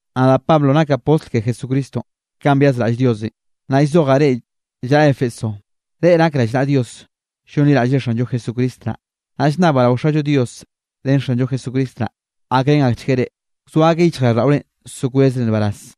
Nadaꞌ Pablo nakaꞌ postl ke Jesucristonꞌ kanꞌ byazraꞌll Diosenꞌ, naꞌ llzojaꞌ reꞌ llaꞌa Éfeso, reꞌ nak rallnaꞌa Dios llonliraꞌllre Xanllo Jesucristo naꞌ. Naꞌ llnnabaꞌ rao Xallo Dios ren Xanllo Jesucristo naꞌ, gakrén akchgueꞌ reꞌ, wzoa akeꞌ yichjraꞌlldaꞌorenꞌ so kwezre nbaraz.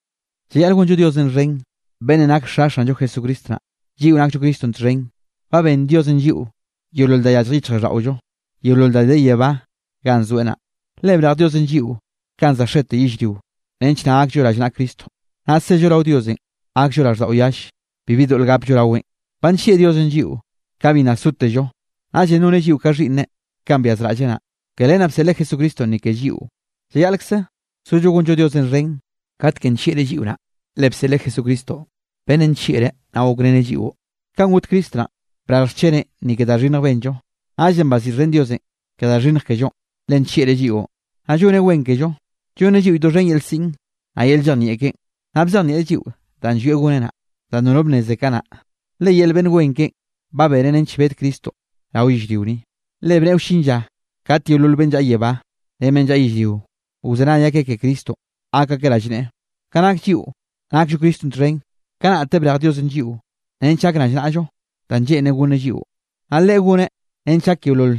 Llayaꞌl gonllo Diosenꞌ xhen beꞌnnenꞌ nake Xa Xanllo Jesucristo naꞌ, lliꞌo nakllo Cristonꞌ txhen, ba benn Diosenꞌ lliꞌo yeolol da yallje yichjraꞌlldaꞌollo, yeolol da de yebá ganꞌ zoeꞌ naꞌ. Le brej Diosenꞌ lliꞌo kanꞌ za xete yellrionꞌ nench naꞌ gakllo rallnaꞌa Cristo, naꞌ sello rao Diosenꞌ gakllo raꞌlldaꞌo yalle, bibi doꞌl gapllo raweꞌn. Ba nllieꞌ Diosenꞌ lliꞌo kanꞌ bi nna sotello. Naꞌllenꞌ noneꞌ lliꞌo ka xhiꞌnneꞌ kanꞌ byazraꞌlleꞌ naꞌ, ke len naꞌ bseꞌleꞌ Jesucristonꞌ ni ke lliꞌo. Llayaꞌlkze sollo gonllo Diosenꞌ xhen katekenꞌ nllieꞌreꞌ lliꞌo naꞌ, le bseꞌleꞌ Jesucristo beꞌnnenꞌ nllieꞌreꞌ naꞌ gokreneꞌ lliꞌo. Kanꞌ got Cristo naꞌn, brarj xcheneꞌ ni ke da xhinnjenꞌ benllo. Naꞌllenꞌ baziꞌxhen Diosenꞌ ke da xhinnj kellonꞌ le nllieꞌreꞌ lliꞌon. Naꞌ lloneꞌ wen kello, llonneꞌ lliꞌo doxhen yel siꞌn, naꞌ yel llejnieꞌ keꞌen. Naꞌ bzejnieꞌreꞌ lliꞌo danꞌ llwieꞌ goneꞌ naꞌ, danꞌ nono bnneze kanaꞌ, le yel beꞌnn wen keꞌen ba benen nench bed Cristonꞌ rao yellrio ni. Le bneꞌe wllin lla kat yeolol beꞌnn llaꞌa yebá ren beꞌnn llaꞌa yellrio, wzenay akeꞌ ke Cristonꞌ gak akeꞌ rallneꞌe. Ka nak lliꞌo nakllo Cristo txhen, kanaꞌte brej Diosenꞌ lliꞌo nench gak rallnaꞌllo danꞌ lleꞌnreꞌ gonneꞌ lliꞌo. Naꞌ Leꞌe goneꞌ nench gak yeolol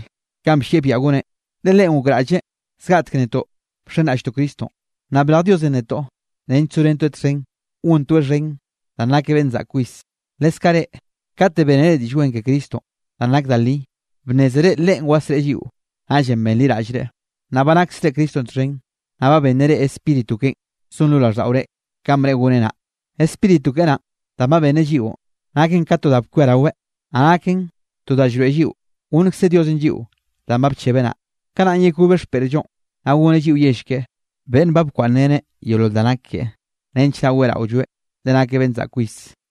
kanꞌ bllieꞌ biaꞌa goneꞌ. Le Leꞌen gokraꞌlleꞌ zgaꞌtek netoꞌn bxenraꞌlltoꞌ Cristonꞌ, naꞌ brej Diosenꞌ netoꞌ nench sorentoeꞌ txhen gontoeꞌ xhen danꞌ nakeꞌ beꞌnn zaꞌk kwis. Leskaꞌ reꞌ, kate bénere Diꞌll Wen ke Cristonꞌ danꞌ nak da li, bnnézere Leꞌen wasreꞌe lliꞌo, naꞌllenꞌ benliraꞌllreꞌ, naꞌ ba naksre Cristonꞌ txhen. Naꞌ ba benneꞌ reꞌ Spíritu keꞌen zon lo raꞌlldaꞌore kanꞌ bneꞌe goneꞌ naꞌ. Spíritu keꞌe naꞌn danꞌ ba benneꞌ lliꞌon naken ka to da bkwiaraweꞌ, naꞌ naken to da llroeꞌ lliꞌo gonnkze Diosenꞌ lliꞌo danꞌ ba bchebeꞌ naꞌ, kanaꞌn yekobeꞌ xpeꞌrllonꞌ, naꞌ goneꞌ lliꞌo yell keꞌe, beꞌnn ba bkwaꞌnnreneꞌ yeolol da nak keꞌe, nench naꞌ weꞌraolloeꞌ, le nakeꞌ beꞌnn zaꞌk kwis.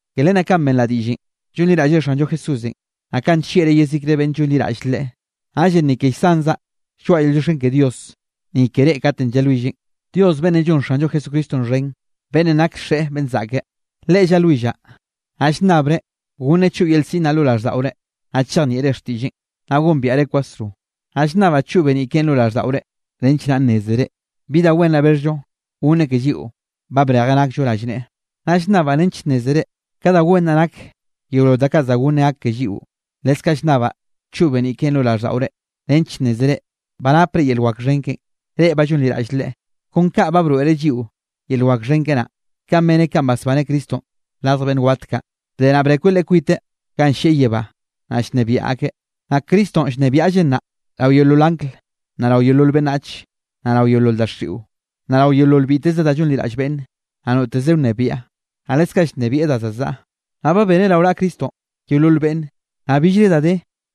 Ke len naꞌ ka benraꞌ diꞌllenꞌ llonliraꞌllre Xanllo Jesúsenꞌ, naꞌ kanꞌ nllieꞌreꞌ yezikre beꞌnn llonliraꞌll Leꞌe, naꞌllenꞌ ni ke llsanzaꞌ lloaꞌa yel llioxken ke Dios, ni ke reꞌ katenꞌ llalwilleꞌn. Dios beꞌnnenꞌ llon Xanllo Jesucristonꞌ xhen, beꞌnnenꞌ nak Xeꞌe beꞌnn zaꞌke, Leꞌe llalwillaꞌ. Naꞌ llnnabreꞌ goneꞌ choꞌ yel siꞌn naꞌ lo raꞌlldaꞌore, naꞌ chejnieꞌre xtiꞌlleꞌn, naꞌ gombiaꞌreꞌ kwasro. Naꞌ llnnabaꞌ choꞌ beniꞌ keꞌen lo raꞌlldaꞌore, nench naꞌ nnézere bi da wen naꞌ bexhllo goneꞌ ke lliꞌo ba brejeꞌ nakllo rallneꞌe. Naꞌ llnnabaꞌ nench nnézere ka da wen naꞌ nak yeolol da kaꞌ za gonneꞌ gak ke lliꞌo. Leskaꞌ llnnabaꞌ choꞌ beniꞌ keꞌen lo raꞌlldaꞌore nench nnézere ba napre yel wak xhen keꞌen, reꞌ ba llonliraꞌll Leꞌe, kon ka ba broeꞌreꞌ lliꞌo yel wak xhen keꞌe naꞌ. Kaꞌn beneꞌ kanꞌ basbaneꞌ Cristonꞌ radj beꞌnn wat kaꞌ. Bde naꞌ brekweꞌ Leꞌe kwite ganꞌ llieꞌ yebánꞌ, naꞌ llnebiaꞌ akeꞌ. Naꞌ Cristonꞌ llnebiaꞌlleꞌ nnaꞌ rao yeolol angl, naꞌ rao yeolol beꞌnnach, naꞌ rao yeolol daxiꞌo, naꞌ rao yeolol biteze da llonliraꞌll beꞌnne, naꞌ noteze wnebiaꞌ. Naꞌ leskaꞌ llnebieꞌ da za zaꞌa. Naꞌ ba beneꞌ rao naꞌa Cristonꞌ yeolol beꞌnne, naꞌ billre da de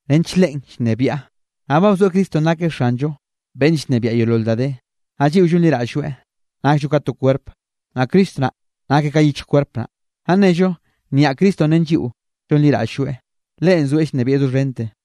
nench Leꞌen llnebiaꞌ. Naꞌ ba bzoeꞌ Cristonꞌ nakeꞌ Xanllo beꞌnn llnebiaꞌ yeolol da de. Naꞌ lliꞌo llonliraꞌll-lloeꞌ nakllo ka to kwerp, naꞌ Cristo naꞌ nakeꞌ ka yichj kwerp naꞌ. Naꞌ nnello nyaꞌ Cristonꞌ ren lliꞌo llonliraꞌll-lloeꞌ, Leꞌen zoeꞌ llnebieꞌ doxhente.